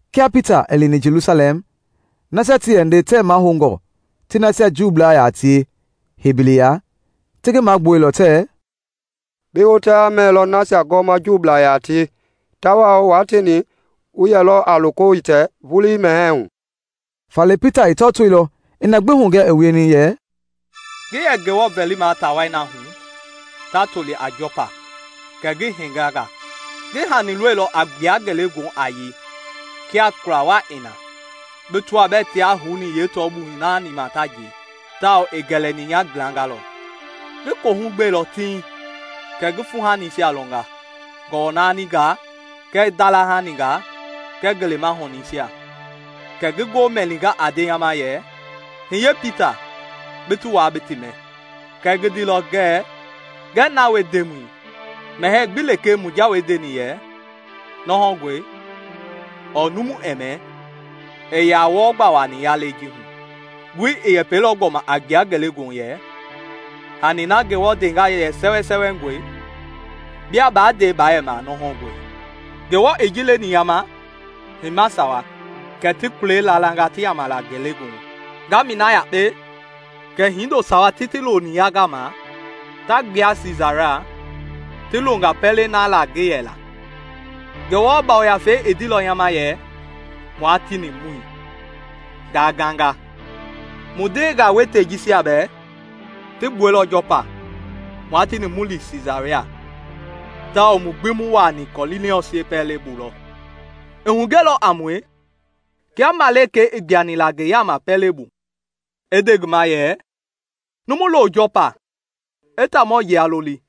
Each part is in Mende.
Kia Pita i lini Jelusalɛm, nasia ti yɛ nde tɛɛ mahoungɔ ti nasia Juublaa yaa tie hei biliya ti ngi magbuɛilɔ tɛɛ, “Bi hotaya mɛilɔ nasia gɔɔma Juublaa yaa tie tawao wua tieni wu yɛlɔ a loko hitɛ vulii mɛhɛɛ hu!” Faale Pita i tɔtoilɔ i na gbi hugɛ i wieni yɛ, “Ngi yɛ Ngewɔ vɛlima taa wai na hu ta toli a Jɔpa kɛ ngi henganga. Ngi hani lɔilɔ a gbua ngelegoohu a yei kia kula waa i na, bi tɔaa bɛɛ tiaa houni yeetɔɔhui naani ma ta njei, tawao i gɛlɛni nya gblanga lɔ. Ngi kohu gbeilɔ tiŋ kɛ ngi fuuhanisia lɔnga: gɔwɔnaaningaa kɛɛ ndalahaningaa kɛɛ ngelema ŋɔningɛisia. Kɛ ngi ngoo mɛninga a nde nya ma yɛ, ‘Hiye, Pita, bi ti waa bi ti mɛ!’ Kɛɛ ngi ndeilɔ ngɛɛ, ‘Ngɛi na wie, Ndemɔi! Mɛhɛɛ gbi lekee mu jawei ndeni yɛ nɔhɔngɔe ɔɔ numu ɛɛ mɛ, ii yaa wɔɔ gba wuaani nya lɛi ji hu.’ Ngoi i yɛpɛilɔ gbɔma a gbua ngelegoohu yɛ, ‘Hani na Ngewɔ ndenga yɛ sɛwɛsɛwɛngɔe, bia baa nde baa yɛma nɔhɔngɔe.’ Ngewɔ i ji leni nya ma heima sawa kɛ ti kulei laalanga ti yaama la ngelegoohu. Ngaamɛi na yakpe, kɛ hindo sawa ti ti loni nya gama ta gbua Siisaria, ti longa pɛlei na laa ngi yɛ na. Ngewɔ Yafei i ndeilɔ nya ma yɛ mua tieni mu li, ngaa ganga. Mu ndeengaa wɛitei jisia bɛɛ ti gbuɛilɔ Jɔpa mua tieni mu li Siisaria tawao mu gbi mu wuaani Kɔniiliɔs yeepɛlɛbu lɔ. I hugɛilɔ a mue kia malikei i gbuani la ngi yaama pɛlei bu, i nde ngi ma yɛ, ‘Numu lo Jɔpa i taamɔ yila loli,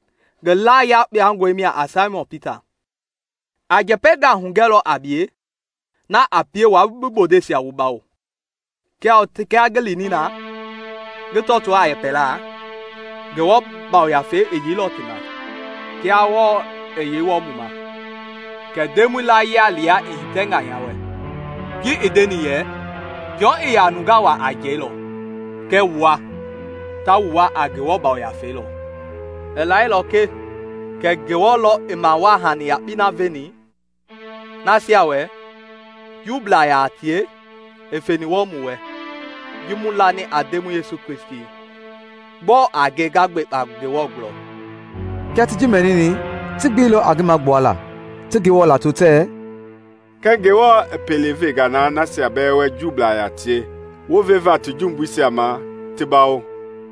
ngi laa yakpangɔi mia a Saimɔn Pita. A njɛpɛngaa hugɛlɔ a bie na a pie wua bi bondeisia wu bawo.’ Tawao kia ngi lini na ngi tɔtoo a yɛpɛla, Ngewɔ Yafei i yeilɔ ti ma kia lɔɔ i yeini wɔɔ mu ma. Kɛ Ndemɔi layia yila i hitɛnga nya wɛ, ji i ndeni yɛ, ‘Jɔn i yɛ nungaa wua a njɛi lɔ kɛɛ wua, ta wu wua a Ngewɔ Yafei lɔ.’ I lailɔ ke kɛ Ngewɔ lɔ i mawaa hani yakpei na veni nasia wɛ Juublaa yaa tie i feni wɔɔ mu wɛ ji mu lani a Ndemɔi Yesu Kristi; gbɔɔ a nge nga gbekpa Ngewɔ gulɔ!” Kia ti ji mɛnini, ti gbeilɔ a ngi magbuala ti Ngewɔ lato tɛɛ, “Kɛ Ngewɔ i pele venga nasia bɛɛ wɛ Juublaa yaa tie wounveva ti jumbuisia ma ti bawo!”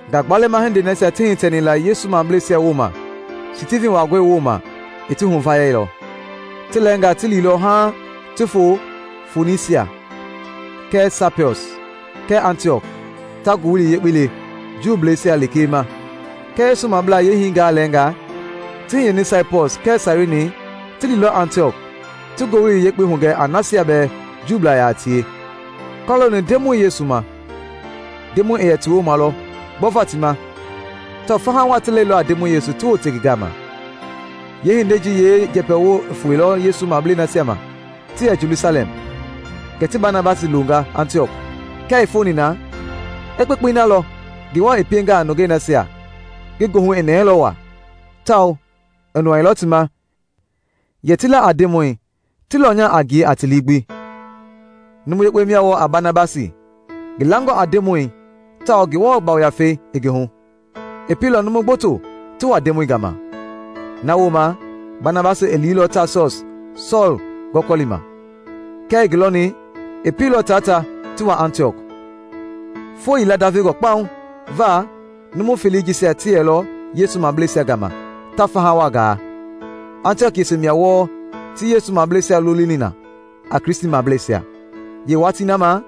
Ngagbalɛma hindei nasia ti hitɛni la Yesu mableisia wooma Stivin waangɔi wooma i ti huvayailɔ. Ti lɛɛngaa ti liilɔ haaŋ ti foo Fonisia kɛɛ Saipɔs kɛɛ Antiɔk ta Ngowili Yekpei le Juuisia lekee ma. Kɛɛ Yesu mablaa yeehingaa lɛɛngaa ti hiyeni Saipɔs kɛɛ Sairini ti liilɔ Antiɔk ti Ngowili Yekpei hugɛ a nasia bɛɛ Juublaa yaa tie kɔlooni Ndemɔi Yesu ma. Ndemɔi i yɛ ti wooma lɔ gbɔva ti ma tawao faha waa ti lɛilɔ a Ndemɔi ti wote ngi gama. Yee hindei ji yee njɛpɛwo i foilɔ Yesu mablei nasia ma ti yɛ Jelusalɛm, kɛ ti Banabasi loonga Antiɔk. Kia i foni na, i kpekpei na lɔ Ngewɔ i pienga a nungei nasia, ngi goohu i nɛɛlɔ waa; tawao i nɔɔilɔ ti ma yɛ ti la a Ndemɔi, ti lɔnya a ngie a ti lii gbi. Numu yekpe mia wɔɔ a Banabasi, ngi langɔ a Ndemɔi tawao Ngewɔ Yafei i ngi hu. I pielɔ numu gboto ti wa Ndemɔi gama. Na wooma Banabasi i liilɔ Taasɔs Sɔɔl gɔkɔlima. Kia i ngi lɔni, i pieilɔ taa ta ti wa Antiɔk. Foo yila ndavengɔ kpauŋ va numu felei jisia ti yɛlɔ Yesu mableisia gama ta faha waa gaa. Antiɔk yese mia wɔɔ ti Yesu mableisia lolini na a Kristimableisia. Yee watii na ma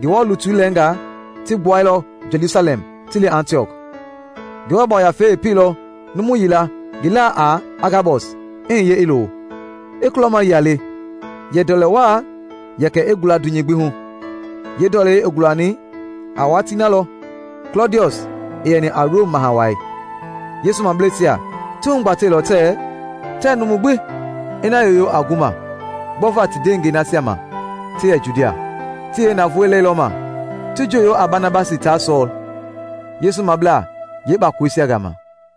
Ngewɔ lutu lɛɛngaa ti gbuailɔ Jelusalɛm ti li Antiɔk. Ngewɔ Yafei i pieilɔ numu yila, ngi laa a Agabɔs, i hiye i lo, i kulɔmayia le yɛ ndɔlɛ waa yɛkɛ i gula dunyei hu gbi. (Yee ndɔlei i gulani a watii na lɔ Klɔdiɔs i yɛni a Rom Maha Wai.) Yesu mableisia ti hugbatɛilɔ tɛɛ numu gbi i na yoyo a gu ma gbɔva ti ndeengɛi nasia ma ti yɛ Judia. Ti yeenavoi lɛilɔma, ti njooyo a Banabasi taa Sɔɔl Yesu mablaa yee kpakoleisia gama.